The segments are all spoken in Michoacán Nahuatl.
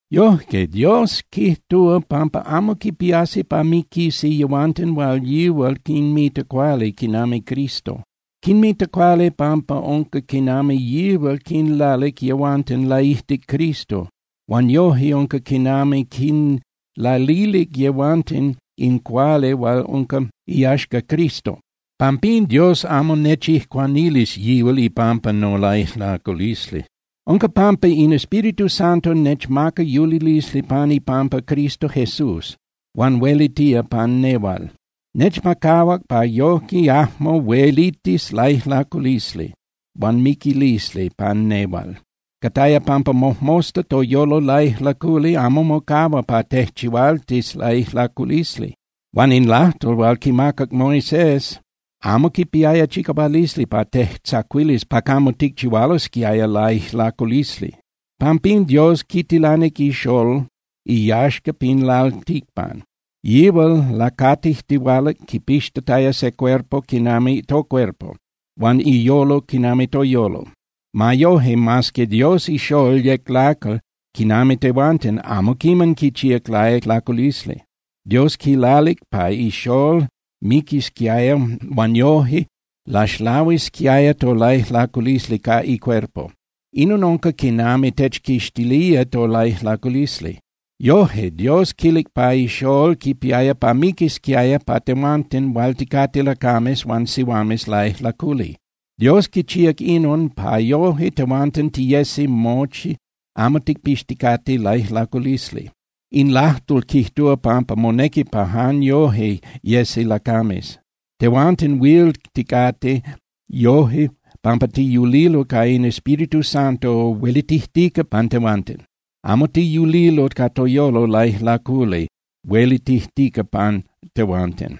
Yojque, Dios quijtúa pampa amo quipiasi pa miquisi yehuanten hual yihual quinmita cuali quinami Cristo. Quinmita cuali pampa unca quinami yihual quinlalic yehuanten laijtic Cristo huan yoje unca quinami quinlalilic yehuanten in cuali hual unca iyaxca Cristo. Pampín Dios amo nechijcuanilis yihual ipampa nolaijlaculisli. Unca pampa in Espíritu Santo nechmaca yulilisli pan ipampa Cristo Jesús huan huelitía pan nehual. Nechmacahuac pa yoje yajmo huelitis laijlaculisli huan miquilisli pan nehual. Cataya pampa mojmosta toyolo laijlaculi amo mocahua pa tejchihualtis laijlaculisli. Huan in lajtol hual quimacac Moisés amo quipiaya chicahualisli pa tejtzacuilis pa camo ticchihualosquiaya laijlaculisli. Pampín, Dios quitilanic iXolol iyaxca pin lalticpan. Yihual lacatijtihualac quipixtataya se cuerpo quinami tocuerpo, huan iyolo quinami toyolo. Ma yoje, mas que Dios ixolol yec lacal quinami tehuanten, amo quiman quichíac laijlaculisli. Dios quilalic pa iXolol miquisquiaya huan yoje laxlahuisquiaya tolaijlaculisli ca icuerpo. Inon unca quinami techquixtilía tolaijlaculisli. Yoje Dios quilic pa iXolol quipiaya pa miquisquiaya pa tehuanten hual ticate lacames huan sihuames laijlaculi. Dios quichíac inon pa yoje tehuanten tiyesi mochi amo ticpixticate laijlaculisli. In lajtol quijtúa pampa monequi pa jan yoje yesi lacames. Tehuanten huil ticate yoje pampa tiyulilo ca in Espíritu Santo huelitijtica pan tehuanten. Amo tiyulilo ca toyolo laijlaculi huelitijtica pan tehuanten.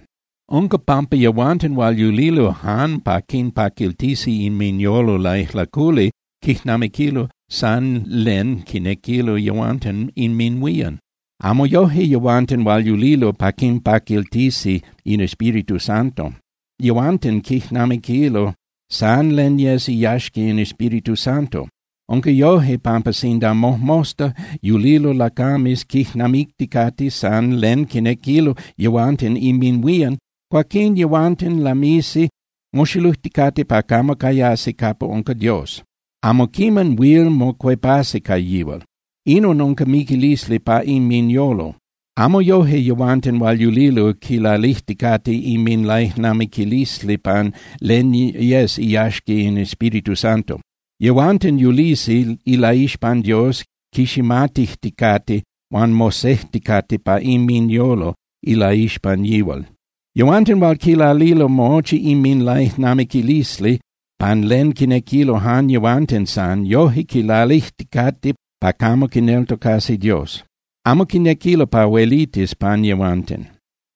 Unca pampa yehuanten hual yulilo jan pa quinpaquiltisi inminyolo laijlaculi quijnamiquilo san len quinequilo yehuanten inminhuían. Amo yoje yehuanten hual yulilo pa quinpaquiltisi in Espíritu Santo. Yehuanten quijnamiquilo san len yes iyaxca in Espíritu Santo. Unca yoje pampa sinda mojmosta yulilo lacames quijnamicticate san len quinequilo yehuanten inminhuían, cuaquín yehuanten lamisi moxilujticate pa camo cayasi capa unca Dios. Amo quiman huil mocuepasi ca yihual. Inon unca miquilisli pa inminyolo. Amo yoje yehuanten hual yulilo quilalijticate inminlaijnamiquilisli pan len yes iyaxca in Espíritu Santo. Yehuanten yulisi ilaixpan Dios quiximatijticate, huan mosejticate pa inminyolo ilaixpan yihual. Yehuanten hual quilalilo mochi inminlaijnamiquilisli pan len quinequilo jan yehuanten san, yoje quilalijticate pa camo quineltocasi Dios. Amo quinequilo pa huelitis pan yehuanten.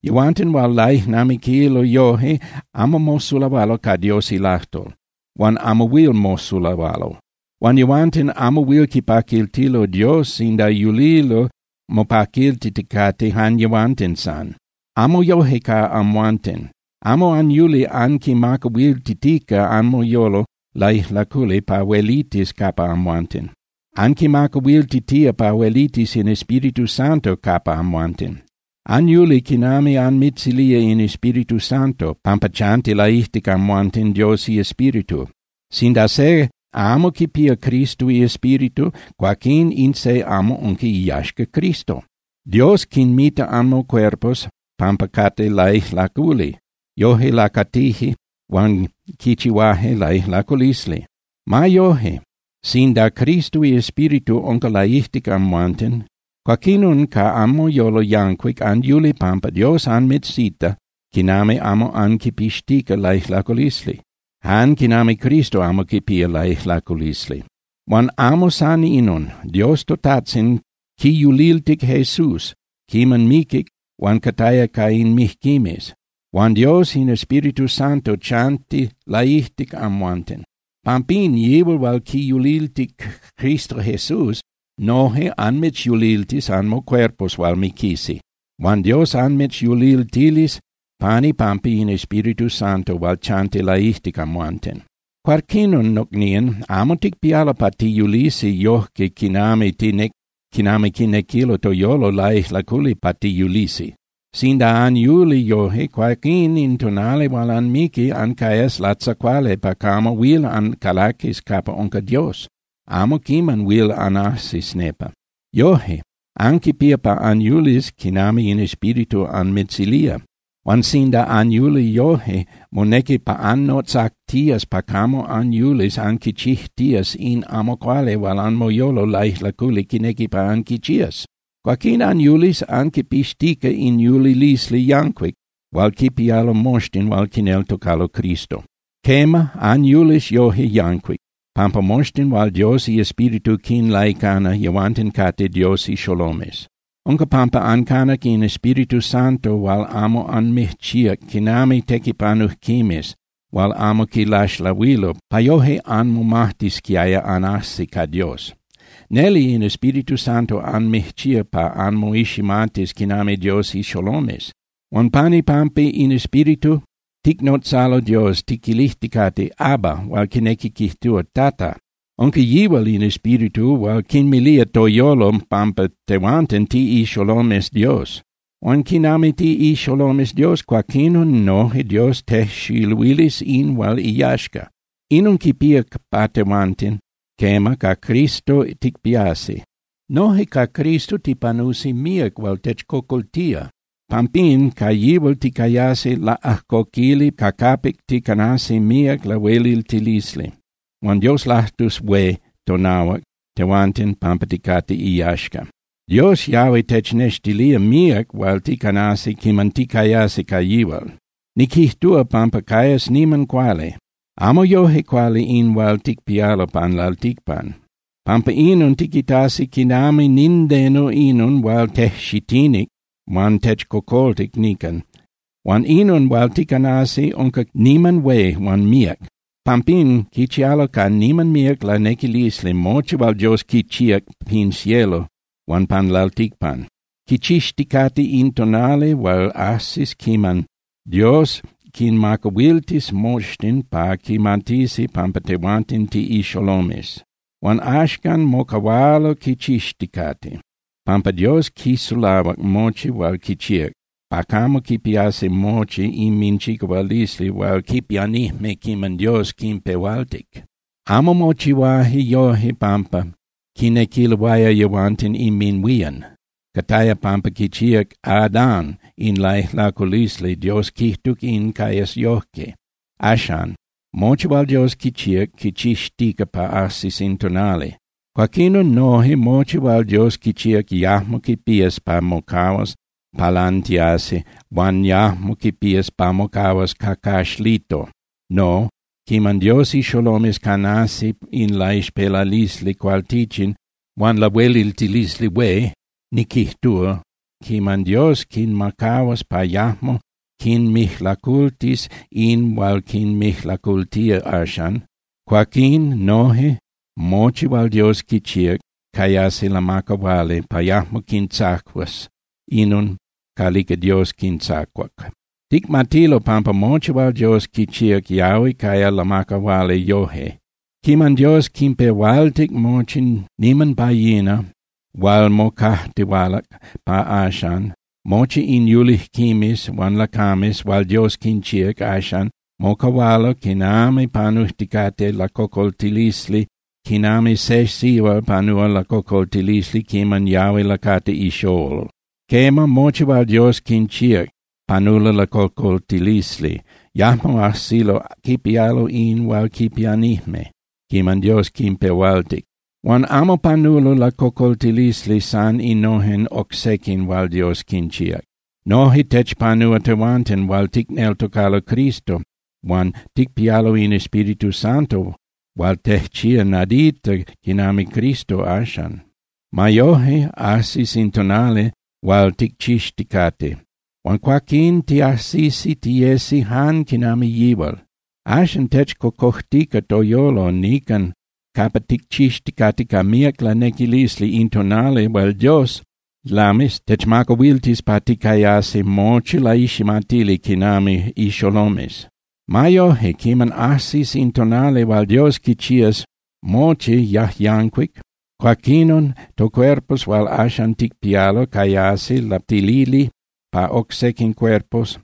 Yehuanten hual laijnamiquilo yoje amo mosulahualo ca Dios ilajtol, huan amo huil mosulahualo. Huan yehuanten amo huil quipaquiltilo Dios sinda yulilo mopaquiltiticate jan yehuanten san. Amo yoje ca amhuanten. Amo anyuli anquinmacahuiltitica anmoyolo laijlaculi pa huelitis capa amhuanten. Anquimacahuiltitía pa huelitis in Espíritu Santo capa amhuanten. Anyuli quinami anmitzilía in Espíritu Santo, pampa chanti laijtic amhuanten Dios iEspíritu. Sinda se amo quipía Cristo iEspíritu, cuaquín in se amo unca iyaxca Cristo. Dios quinmita anmocuerpos pampa cate laijlaculi, yoje lacatije huan quichihuaje laijlaculisli. Ma yoje, sinda Cristo iEspíritu unca laijtic amhuanten, cuaquinon ca anmoyolo yancuic anyuli pampa Dios anmitzita quinami amo anquipixtica laijlaculisli, jan quinami Cristo amo quipía laijlaculisli. Huan amo san inon. Dios toTajtzin quiyuliltic Jesús quiman miquic huan cataya ca in mijquimes. Huan Dios in Espíritu Santo chanti laijtic amhuanten. Pampín, yihual hual quiyuliltic Cristo Jesús noje anmitzyuliltis anmocuerpos hual miquisi. Huan Dios anmitzyuliltilis pan ipampa in Espíritu Santo hual chanti laijtic amhuanten. Cuaquinon, nocnían, amo ticpialo pa tiyulisi yojque quinami quinequilo toyolo laijlaculi pa tiyulisi. Sinda anyuli yoje, cuaquín in tonali hual anmiqui, ancayas latzacuali pa camo huil ancalaquis capa unca Dios, amo quiman huil anajsis nepa. Yoje, anquipía pa anyulis quinami in Espíritu anmitzilía. Huan sinda anyuli yoje, monequi pa anmotzactías pa camo anyulis anquichijtías in amo cuali hual anmoyolo laijlaculi quinequi pa anquichías. Cuaquín anyulis anquipixtica in yulilisli yancuic hual quipialo moxtin hual quineltocalo Cristo. Quema, anyulis yoje yancuic, pampa moxtin hual Dios iEspíritu quinlaicana, yehuanten cate Dios ixolomes. Unca pampa ancanac in Espíritu Santo hual amo anmijchíac quinami tequipanujquimes hual amo quilaxlahuilo pa yoje anmomajtisquiaya anajsi ca Dios. Neli in Espíritu Santo anmijchíac pa anmoiximatis quinami Dios ixolomes. Huan pan ipampa in Espíritu ticnotzalo Dios tiquilijticate: “¡Abba!”, hual quinequi quijtúa “¡Tata!” Unca yihual in Espíritu hual quinmilía toyolo pampa tehuanten tiꞌixolomes Dios. Huan quinami tiꞌixolomes Dios, cuaquinon noje Dios tejxiluilis in hual iyaxca. Inon quipía pa tehuanten, quema, ca Cristo ticpiasi. Noje ca Cristo tipanusi míac hual techcocoltía. Pampín ca yihual ticayasi laꞌajcoquili ca capic ticanasi míac lahueliltilisli. Huan Dios lajtus hué tonahuac tehuanten pampa ticate iyaxca. Dios yahui technextilía míac hual ticanasi quiman ticayasi ca yihual. Niquijtúa pampa cayas niman cuali. Amo yoje cuali in hual ticpialo pan lalticpan. Pampa inon, tiquitasi quinami nindeno inon hual tejxitinic huan techcocoltic nican. Huan inon hual ticanasi unca niman hué huan míac. Pampín quichialo ca niman míac lanequilisli mochi hual Dios quichíac pin cielo huan pan lalticpan. Quichixticate in tonali hual ajsis quiman Dios quinmacahuiltis moxtin pa quimatisi pampa tehuanten tiꞌixolomes. Huan axcan mocahualo quichixticate, pampa Dios quisulahuac mochi hual quichíac pa camo quipiasi mochi inminchicahualisli hual quipianijme quiman Dios quinpehualtic. Amo mochihuaje yoje pampa quinequiloaya yehuanten inminhuían. Cataya pampa quichíac Adán in laijlaculisli Dios quijtuc pa cayas yojque. Axan, mochi hual Dios quichíac quichixtica pa ajsis in tonali. Cuaquinon noje, mochi hual Dios quichíac yajmo quipías pa mocahuas palantiasi huan yajmo quipías pa mocahuas cacaxlito. No, quiman Dios ixolomes canasi in laixpelalisli cualtichin huan lahueliltilisli hué, niquijtúa, quiman Dios quinmacahuas pa yajmo quinmijlacultis in hual quinmijlacultía axan, cuaquín noje mochi hual Dios quichíac cayasi lamacahuali pa yajmo quintzacuas inon calica Dios quintzacuac. Ticmatilo pampa mochi hual Dios quichíac yahui caya lamacahuali yoje. Quiman Dios quinpehualtic mochi niman pa yina hual mocajtihualac pa axan, mochi in yulijquimes huan lacames hual Dios quinchíac axan mocahualo quinami panujticate lacocoltilisli quinami se sihual panúa lacocoltilisli quiman yahui lacati ixolol. Quema, mochi hual Dios quinchíac panulo lacocoltilisli, yajmo ajsilo quipialo in hual quipianijme quiman Dios quinpehualtic. Huan amo panulo lacocoltilisli san innojen oc sequin hual Dios quinchíac. Noje techpanúa tehuanten hual ticneltocalo Cristo huan ticpialo in Espíritu Santo hual tejchía nadita quinami Cristo axan. Ma yoje, ajsis in tonali hual ticchixticate, huan cuaquín tiajsisi tiyesi jan quinami yihual. Axan techcocojtica toyolo nican capa ticchixticate ca míac lanequilisli in tonali hual Dios lamis techmacahuiltis pa ticayasi mochi laiximatili quinami ixolomes. Ma yoje, quiman ajsis in tonali hual Dios quichías mochi yajyancuic, cuaquinon tocuerpos hual axan ticpialo cayasi lapatilili pa oc sequin cuerpos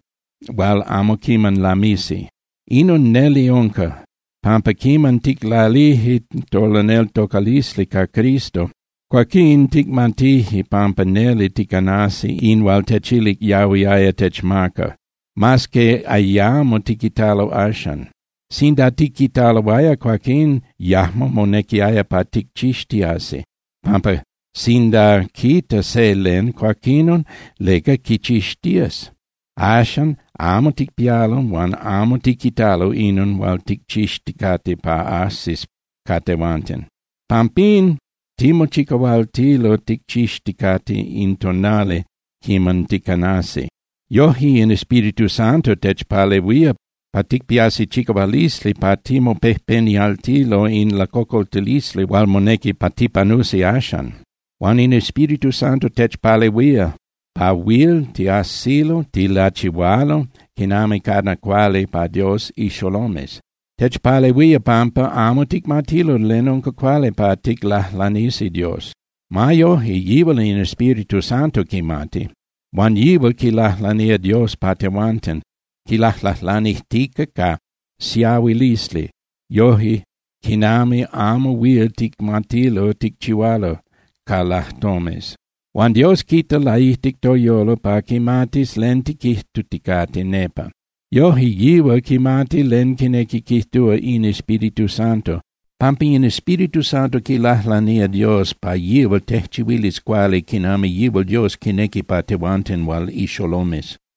hual amo quiman lamisi. Inon neli unca, pampa quiman ticlalije tolaneltocalisli ca Cristo, cuaquín ticmatije pampa neli ticanasi in hual techilic yahuiaya techmaca, mas que ayamo tiquitalo axan. Sinda tiquitaloaya, cuaquín yajmo monequiaya pa ticchixtiasi, pampa sinda quita se len, cuaquinon ¿leca quichixtías? Axan amo ticpialo huan amo tiquitalo inon hual ticchixticate pa ajsis ca tehuanten. Pampín timochicahualtilo ticchixticate in tonali quiman ticanasi. Yoje in Espíritu Santo techpalehuía pa ticpiasi chicahualisli pa timopejpenialtilo in lacocoltilisli hual monequi pa tipanusi axan. Huan in Espíritu Santo techpalehuía pa huil tiajsilo tilachihualo quinami cana cuali pa Dios ixolomes. Techpalehuía pampa amo ticmatilo len unca cuali pa ticlajlanisi Dios. Ma yoje, yihual in Espíritu Santo quimati. Huan yihual quilajlanía Dios pa tehuanten, quilajlajlanijtica ca siahuilisli yoje quinami amo huil ticmatilo ticchihualo ca lajtomes. Huan Dios quita laijtic toyolo pa quimatis len tiquijtuticate nepa. Yoje yihual quimati len quinequi quijtúa in Espíritu Santo, pampa in Espíritu Santo quilajlanía Dios pa yihual tejchihuilis cuali quinami yihual Dios quinequi pa tehuanten hual ixolomes.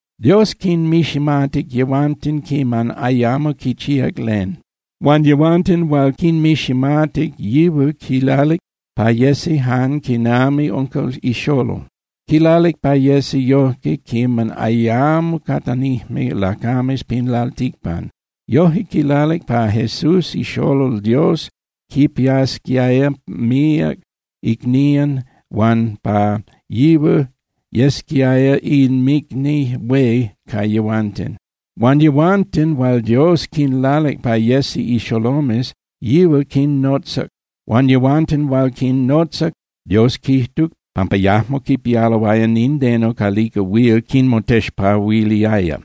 Dios quinmiximatic yehuanten quiman ayamo quichíac len. Huan yehuanten hual quinmiximatic, yihual quilalic pa yesi jan quinami unca ixolol. Quilalic pa yesi yojque quiman ayamo catanijme lacames pan lalticpan. Yoje quilalic pa Jesús ixolol Dios quinpiasquiaya míac icnían huan pa yihual yesquiaya inmicni hué ca yehuanten. Huan yehuanten hual Dios quinlalic pa yesi ixolomes, yihual quinnotzac. Huan yehuanten hual quinnotzac, Dios quijtuc pampa yajmo quipialoaya nindeno calica huil quinmotexpahuiliaya.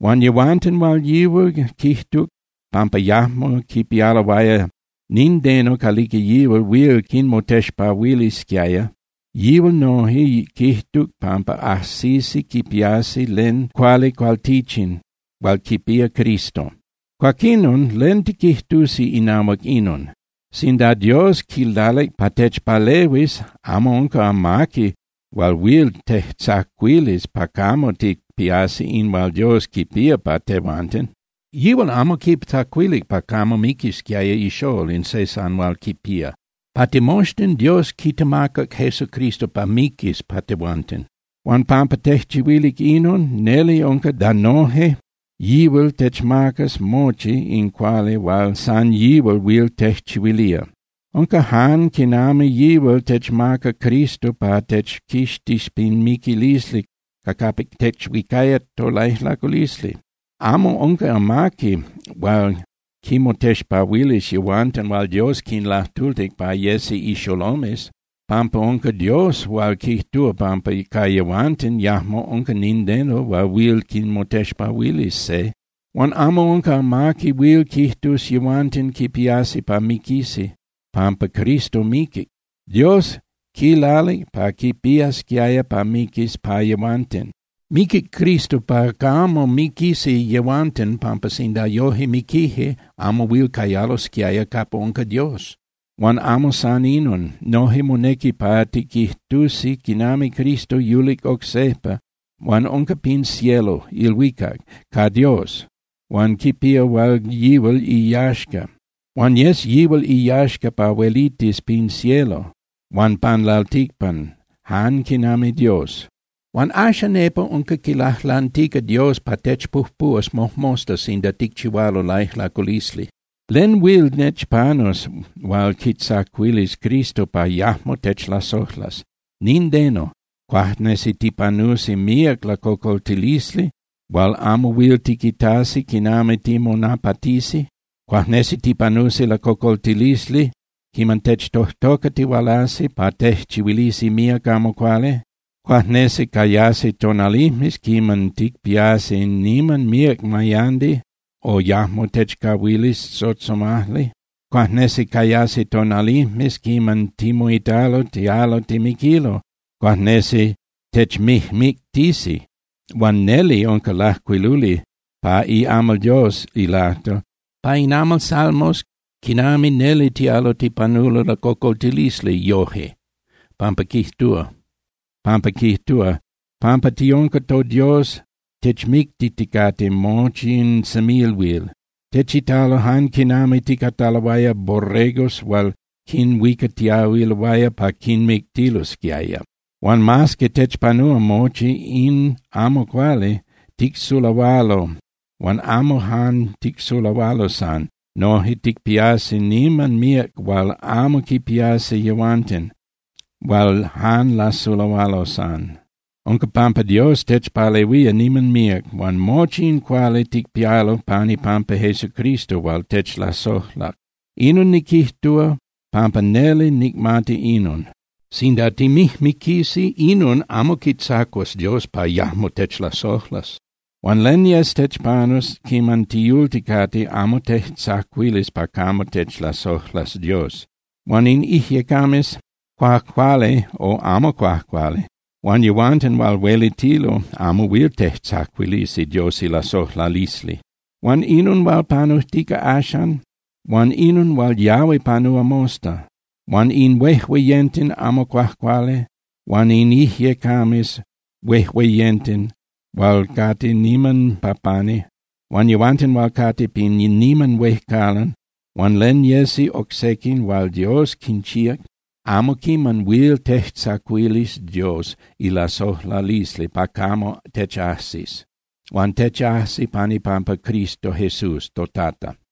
Huan yehuanten hual yihual quijtuc pampa yajmo quipialoaya nindeno calica yihual huil quinmotexpahuilisquiaya, yihual noje quijtuc pampa ajsisi quipiasi len cuali cualtichin hual quipía Cristo. Cuaquinon, ¿len tiquijtusi inahuac inon? Sinda Dios quilalic pa techpalehuis, amo unca amaqui hual huil tejtzacuilis pa camo ticpiasi in hual Dios quipía pa tehuanten. Yihual amo quitzacuilic pa camo miquisquiaya ixolol, in se san hual quipía. Pa timoxtin Dios quitemacac Jesucristo pa miquis pa tehuanten. Huan pampa tejchihuilic inon, neli unca da noje yihual techmacas mochi in cuali hual san yihual huil tejchihuilía. Unca jan quinami yihual techmaca Cristo pa techquixtis pin miquilisli ca capic techuicaya tolaijlaculisli. Amo unca amaqui hual quinmotexpahuilis yehuanten hual Dios quinlajtultic pa yesi ixolomes, pampa unca Dios hual quijtúa pampa ca yehuanten yajmo unca nindeno hual huil quinmotexpahuilis se. Huan amo unca amaqui huil quijtus yehuanten quipiasi pa miquisi, pampa Cristo miquic, Dios quilalic pa quipiasquiaya pa miquis pa yehuanten. Miquic Cristo pa camo miquisi yehuanten pampa sinda yoje miquije, amo huil cayalosquiaya capa unca Dios. Huan amo san inon. Noje monequi pa tiquijtusi quinami Cristo yulic oc sejpa huan unca pin cielo (ilhuicac) ca Dios huan quipía hual yihual iyaxca. Huan yes yihual iyaxca pa huelitis pin cielo huan pan lalticpan jan quinami Dios. Huan axan nepa unca quilajlantica Dios pa techpujpuhuas mojmosta sinda ticchihualo laijlaculisli. ¿Len huil techpanus hual quitzacuilis Cristo pa yajmo techlasojlas? Nindeno. Cuajnesi tipanusi míac lacocoltilisli hual amo huil tiquitasi quinami timonapatisi. Cuajnesi tipanusi lacocoltilisli quiman techtojtocatihualasi pa tejchihuilisi míac amo cuali. Cuajnesi cayasi tonalijmes quiman ticpiasi niman míac mayandi o yajmo techcahuilis tzotzomajli. Cuajnesi cayasi tonalijmes quiman timoitalo tialo timiquilo. Cuajnesi techmijmictisi. Huan neli unca lajcuiluli pa iamal Dios ilajtol, pa in amal Salmos quinami neli tialo tipanulo lacocoltilisli yoje, pampa quijtúa: Pampa tiunca toDios, techmictiticate mochi in semilhuil, techitalo jan quinami ticataloaya borregos hual quinhuicatiahuiloaya pa quinmictilosquiaya. Huan mas que techpanúa mochi in amo cuali, ticsulahualo. Huan amo jan ticsulahualo san. Noje ticpiasi niman míac hual amo quipiasi yehuanten hual jan lasulahualo san. Unca pampa Dios techpalehuía niman míac. Huan mochi in cuali ticpialo pan ipampa Jesucristo hual techlasojlac. Inon niquijtúa pampa neli nicmati inon: Sinda timijmiquisi, inon amo quitzacuas Dios pa yajmo techlasojlas. Huan len yes techpanus quiman tiyulticate amo tejtzacuilis pa camo techlasojlas Dios. Huan in ijyecames cuajcuali o amo cuajcuali, huan yehuanten hual huelitilo amo huil tejtzacuilisi Dios ilasojlalisli. Huan inon hual panujtica axan, huan inon hual yahui panúa mosta, huan in huejueyenten amo cuajcuali, huan in ijyecames huejueyenten hual cate niman pa pani, huan yehuanten hual cate pin niman huejcalan, huan len yesi oc sequin hual Dios quinchíac amo quiman huil tejtzacuilis Dios ilasojlalisli pa camo techajsis. Huan techajsi pan ipampa Cristo Jesús toTata.